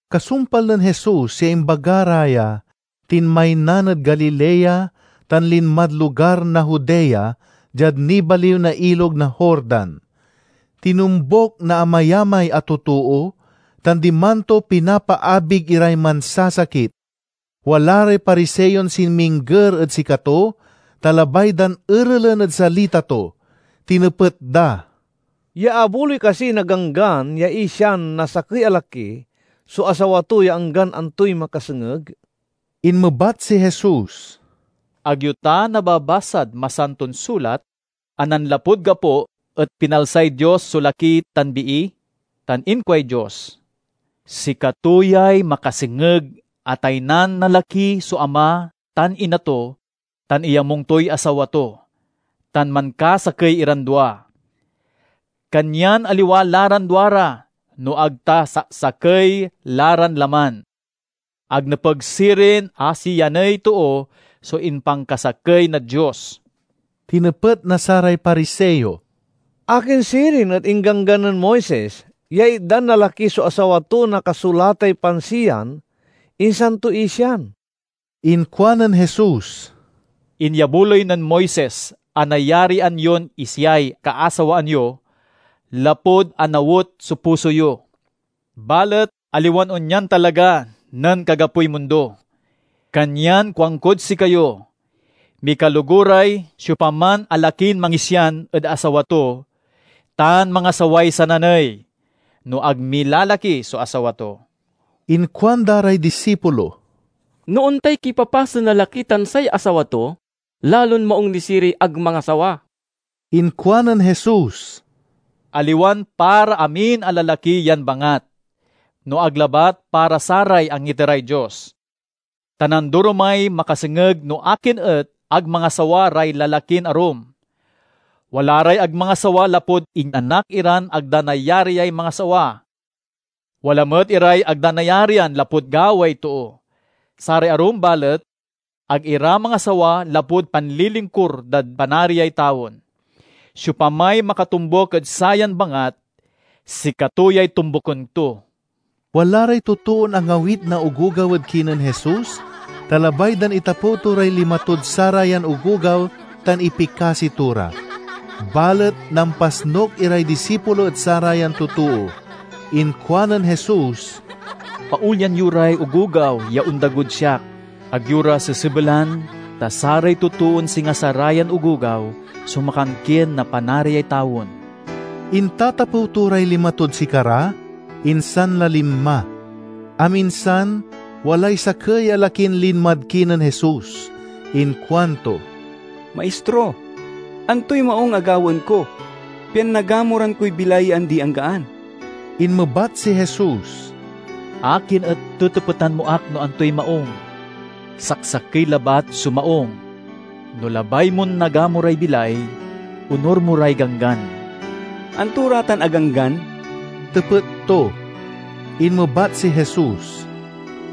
Kasumpal nen Jesus ya imbaga ra ya, tinmaynan ed Galilea tan linmad lugar na Judea, diad nibaliw na Ilog na Jordan. Tinombuk na amayamay a totoo, tan diman to pinapaabig iray mansasakit. Wala ray Pariseon sinmingger ed sikato, ta labay dan erelen ed salita to. Tinepet da, "Iyaabuloy kasi na Ganggan ya isian na sakey a laki so asawa to ya anggan antoy makasengeg?" Inmebat si Jesus, "Ag yo ta nababasad Masanton Sulat a nanlapud gapo et pinalsay Dios so laki tan bii? Tan inkuay Dios, 'Sikato yay makasengeg a taynan na laki so ama tan ina to tan iyamung toy asawa to, tan mankasakey iran dua.' Kanyan aliwa la ran duara no ag ta saksakey la ran laman. Ag nepeg sirin a siyaney too so impankasakey na Dios." Tinepet na saray Pariseo, "Akin sirin et ingganggan nen Moises ya itdan na laki so asawa to na kasulatay pansiyan insan to isian?" Inkuanen Jesus, "Inyabuloy nen Moises a nayarian yon isiay kaasawaan yo lapud anawet so puso yo. Balet aliwan onyan talaga nen kagapoy mundo. Kanyan kuankod sikayo: mikaloguray siopaman a lakin mangisian ed asawa to tan mangasaway sananey, no ag milalaki so asawa to." Inkuanda ray disipulo, "No ontay kipapasen na laki tan say asawa to, lalon maung ni siriy ag mangasawa." Inkuanen Jesus, "Aliwan para amin a lalaki yan bangat, no ag labat para saray angiteray Dios. Ta nandoromay makasengeg no akin et ag mangasawa ray lalakin arum. Wala ray ag mangasawa lapud inanak iran ag da nayariay mangasawa; wala met iray ag da nayarian lapud gaway too; saray arum, balet, ag ira mangasawa lapud panlilingkur dad Panariay tawen. Siopamay makatombuk ed sayan bangat sikato yay tombuken to." Wala ray totoon angawit na ogogaw ed kinen Jesus, ta labay dan itapew to ray lima tod sarayan ogogaw tan ipikasi to ra. Balet nampasnuk iray disipulo ed sarayan totoo. Inkuanen Jesus, "Paolyan yo ray ogogaw ya ondagod siak. Ag yo ra sesebelan, ta saray totoon singa sarayan ogogaw so makankien na Panariay tawen." Intatapew to ray lima tod sikara, insan la linma. Aminsan, walay sakey a lakin linmad kinen Jesus. Inkuanto, "Maistro, antoy maung a gawaen ko, pian nagamuran koy bilay ya andi-anggaan?" Inmebat si Jesus, "Akin et tetepetan mo ak no antoy maung? Saksakey labat so maung. No labay mon nagamuray bilay, onur mo ray ganggan." "Anto ra tan a ganggan?" tepet to. Inmebat si Jesus,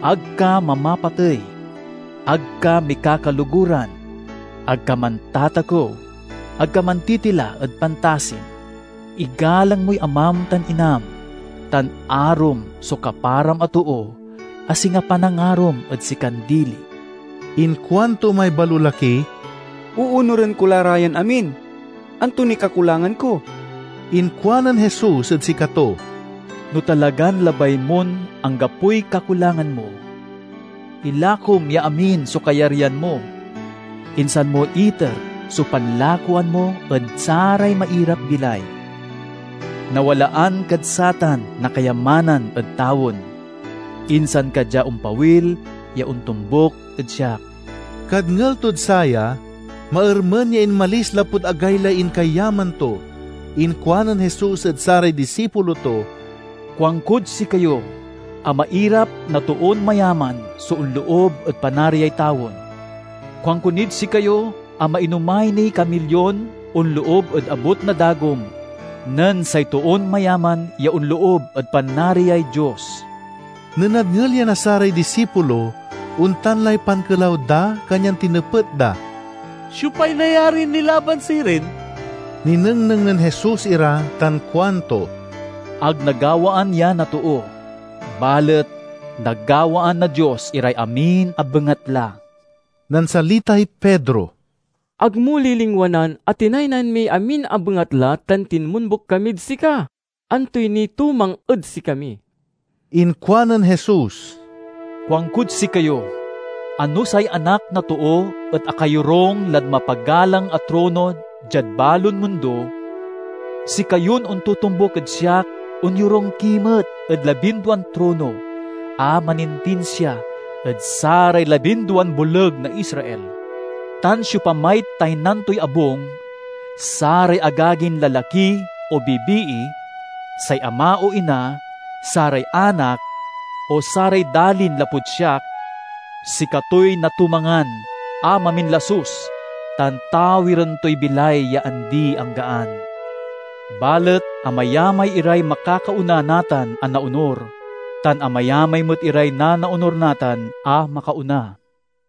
"Ag ka mamapatey; ag ka mikakaloguran; ag ka mantatakew; ag ka mantitila ed pantasim; igalang moy amam tan inam; tan arom so kaparam a too a singa panangarom ed sikan dili." Inkuanto may balolaki, "Oonuren ko la ra yan amin. Anto niy kakulangan ko?" Inkuanen Jesus ed sikato, "No talagan labay mon anggapoy kakulangan mo, ilakom ya amin so kayaryan mo, insan mo iter so panlakoan mo ed saray mairap-bilay. Nawalaan kad satan na kayamanan ed tawen. Insan ka dia ompawil ya ontombuk ed siak." Kadngel tod saya, maermen ya inmalis lapud agaylay inkayaman to. Inkuanen Jesus ed saray disipulo to, "Kuankod sikayo a mairap na toon mayaman so onloob ed Panariay tawen. Kuanko nid sikayo a mainomay niy kamilyon onloob ed abut na dagom nen say toon mayaman ya onloob ed Panariay Dios." Nen nadngel ya na saray disipulo, ontan lay pankelaw da kanyan tinepet da, "Siopay nayarin nilaban sirin?" Ninengneng nen Jesus ira tan kuanto, "Ag nagawaan ya na too, balet nagawaan na Dios iray amin a bengatla." Nansalitay Pedro, "Ag mo lilingwanan a tinaynan miy amin a bengatla tan tinmombuk kamid sika. Antoy nitumang ed sikami?" Inkuanen Jesus, "Kuankod sikayo a no say Anak na Too et akayorung lad mapagalang a trono diad Balon Mundo, sikayon ontotombuk ed siak onyorung ki met ed labinduan trono a manintinsia ed saray labinduan boleg na Israel. Tan siopamay taynan toy abung, saray agagin lalaki o bibii, say ama o ina, saray anak, o saray dalin lapud siak—sikatoy natumangan a maminlasus tan tawiren toy bilay ya andi-anggaan. Balet amayamay iray makakaona natan a naonur, tan amayamay met iray nanaonur natan a makaona."